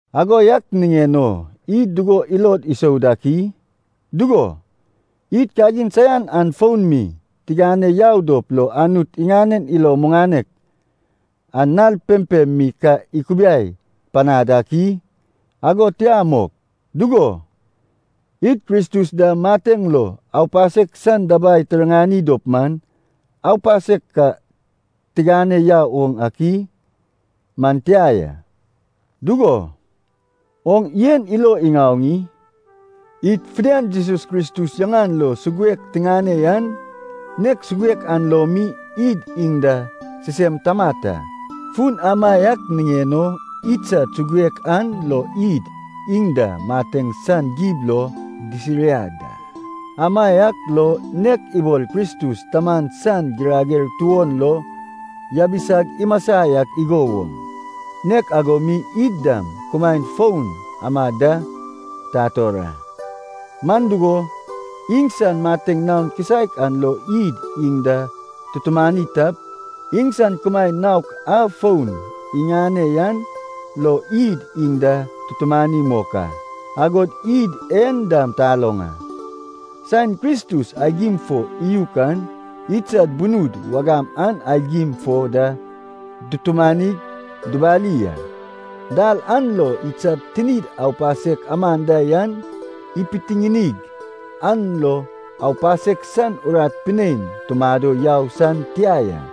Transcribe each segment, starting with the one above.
Ago yak niŋen o id dugo ilod isou dak i? Dugo, id kagin saian an fon mi tigane yau dop lo Anut iŋanen ilo muŋanek an nal pempem mi ka ikubiai panad ak i? Ago tia mok! Dugo, id Kristus da mateŋ lo aupasek san dabai tiriŋani dop man, aupasek ka tigane yau oŋ ak i? Man tia ya. Dugo, oŋ en ilo iŋaoŋ i? Id fidian Jesus Kristus yaŋan lo suguek tiŋane yan, nek suguek an lo mi id iŋ da sisem tamat a. Fun amaiak niŋen o idsad suguek an lo id iŋ da mateŋ san gib lo disiriad a. Amaiak lo nek ibol Kristus Taman san girager tuon lo yabisag imasa yak igo woŋ, nek ago mi id dam kumaen foun amad da tator a. Man dugo, iŋsan mateŋ naon kisaek an lo id iŋ da tutumani tap, iŋsan kumaen naok a foun iŋane yan lo id iŋ da tutumani mok a. Agod id en dam taloŋ a. Saen Kristus aigim fo iyuk an idsad bunud wagam an aigim fo da dutumanig dubali a. Dal an lo idsad tinid aupasek aman da yan ipitiŋinig, an lo aupasek san urat pinein tumado yau san tia ya.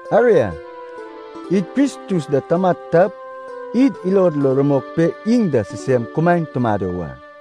Aria, id Kristus da tamat tap, id ilod lo rumok pe iŋ da sisem kumaen tumado wa.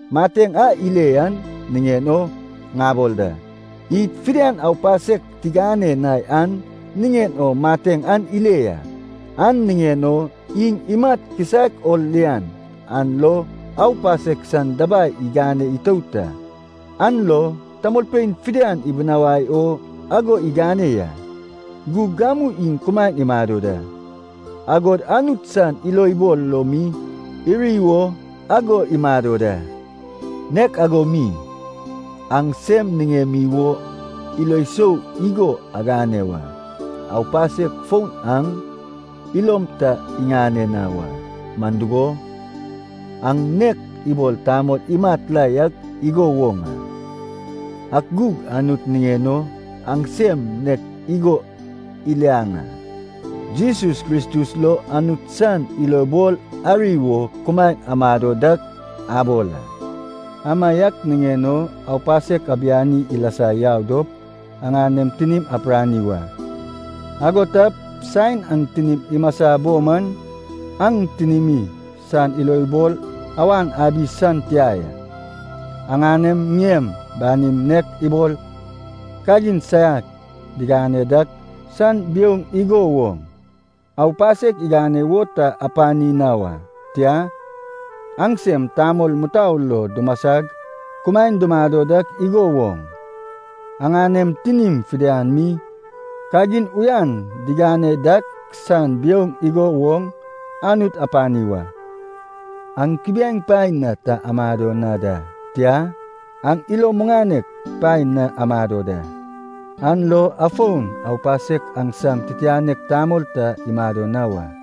Mateŋ a ile yan niŋen o ŋabol da. Id fidian aupasek tigane na yan niŋen o mateŋ an ile ya. An niŋen o iŋ imat kisaek o lian an lo aupasek san dabai igane itout a. An lo tamolpein fidian ibinawai o ago igane ya. Gug gamu iŋ kumaen imado da, agod Anut san ilobol lo mi iri wo ago imado da. Nek ago mi, aŋsem niŋemi wo ilo sou igo agane wa. Aupasek fon aŋ ilom ta iŋane na wa, man dugo, aŋ nek ibol tamol imat la yak igo woŋ a. Ak gug Anut niŋen o, aŋsem nek igo iliaŋ a, Jesus Kristus lo Anut san ilobol ari wo kumaen amado dak abol a. Amaiak niŋen o, aupasek abiani ilasa yau dop aŋanem tinim apirani wa. Ago tap, saen aŋ tinim imasa bo man, aŋ tinimi san ilobol awan abi san tia ya. Aŋanem ŋiem banim nek ibol kagin saiak digane dak san biouŋ igo woŋ, aupasek igane wo ta apani na wa. Tia, aŋsem tamol mutou lo dumasag kumaen dumado dak igo woŋ, aŋanem tinim fidian mi kagin uyan digane dak san biouŋ igo woŋ, Anut apani wa. Aŋ kubiaeŋ paen na ta amado na da, tia, aŋ ilo muŋanek paen na amado da. An lo afon aupasek aŋsam titianek tamol ta imado na wa.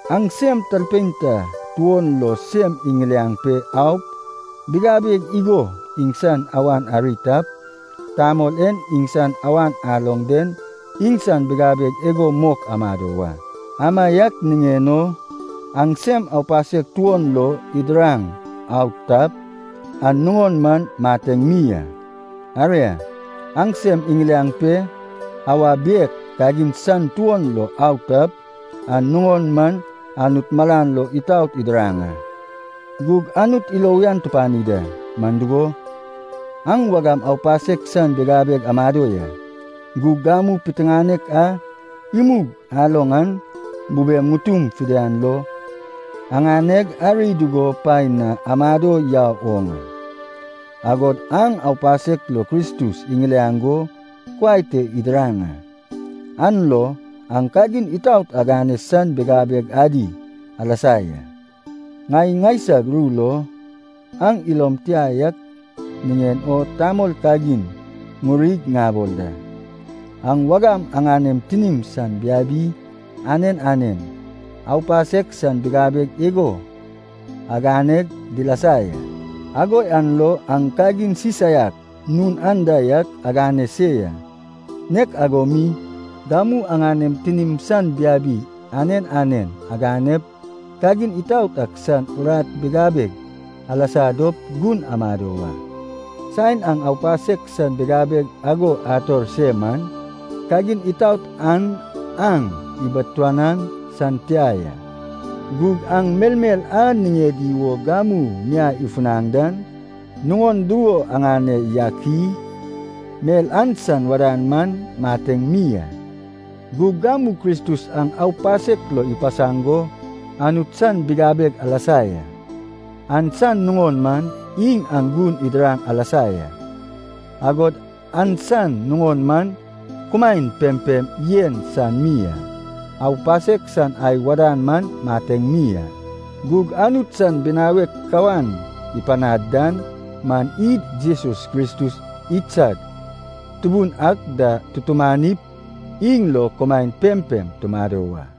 Aŋsem talpein ta tuon lo sem iŋiliaŋ pe aup bigabeg igo iŋsan awan ari tap, tamol e iŋsan awan aloŋ den iŋsan bigabeg igo mok amado wa. Amaiak niŋen o, aŋsem aupasek tuon lo idiraŋ au tap, an nuŋon man mateŋ mi a. Aria, aŋsem iŋiliaŋ pe awa biek kagin san tuon lo au tap, an nuŋon man Anut malan lo itaot idiraŋ a. Gug Anut ilo uyan tupani da. Man dugo, aŋ wagam aupasek san bigabeg amado ya, gug gamu piteŋanek a imug aloŋ an bubem ŋutum fidian lo aŋaneg ari dugo paen na amado yau oŋ a. Agod aŋ aupasek lo Kristus iŋiliaŋ go kuai te idiraŋ a. An lo aŋ kagin itaot agane san bigabeg adi alasa ya. Ŋai ŋaisag ru lo, aŋ ilom tia yak niŋen o tamol kagin ŋurig ŋabol da. Aŋ wagam aŋanem tinim san biabi anen anen, aupasek san bigabeg igo aganeg dilasa ya. Ago yan lo aŋ kagin sisaiak nun anda yak agane se ya. Nek ago mi gamu aŋanem tinim san biabi anen anen aganep, kagin itaot ak san urat bigabeg alasa dop gun amado wa. Saen aŋ aupasek san bigabeg ago ator se man, kagin itaot an aŋ ibiatuanaŋ san tia ya. Gug aŋ melmel a niŋedi wo gamu miai ifunaŋ dan nuŋon dugo aŋane yak i? Mel an san wadan man mateŋ mi a. Gug gamu Kristus aŋ aupasek lo ipasaŋ go Anut san bigabeg alasa ya. An san nuŋon man iŋ aŋ gun idiraŋ alasa ya. Agod an san nuŋon man kumaen pempem yen san mi a. Aupasek san ai wadan man mateŋ mi a. Gug Anut san binawek kawan ipanad dan man id Jesus Kristus idsad Tubun ak da tutumanip, iŋ lo kumaen pempem tumado wa.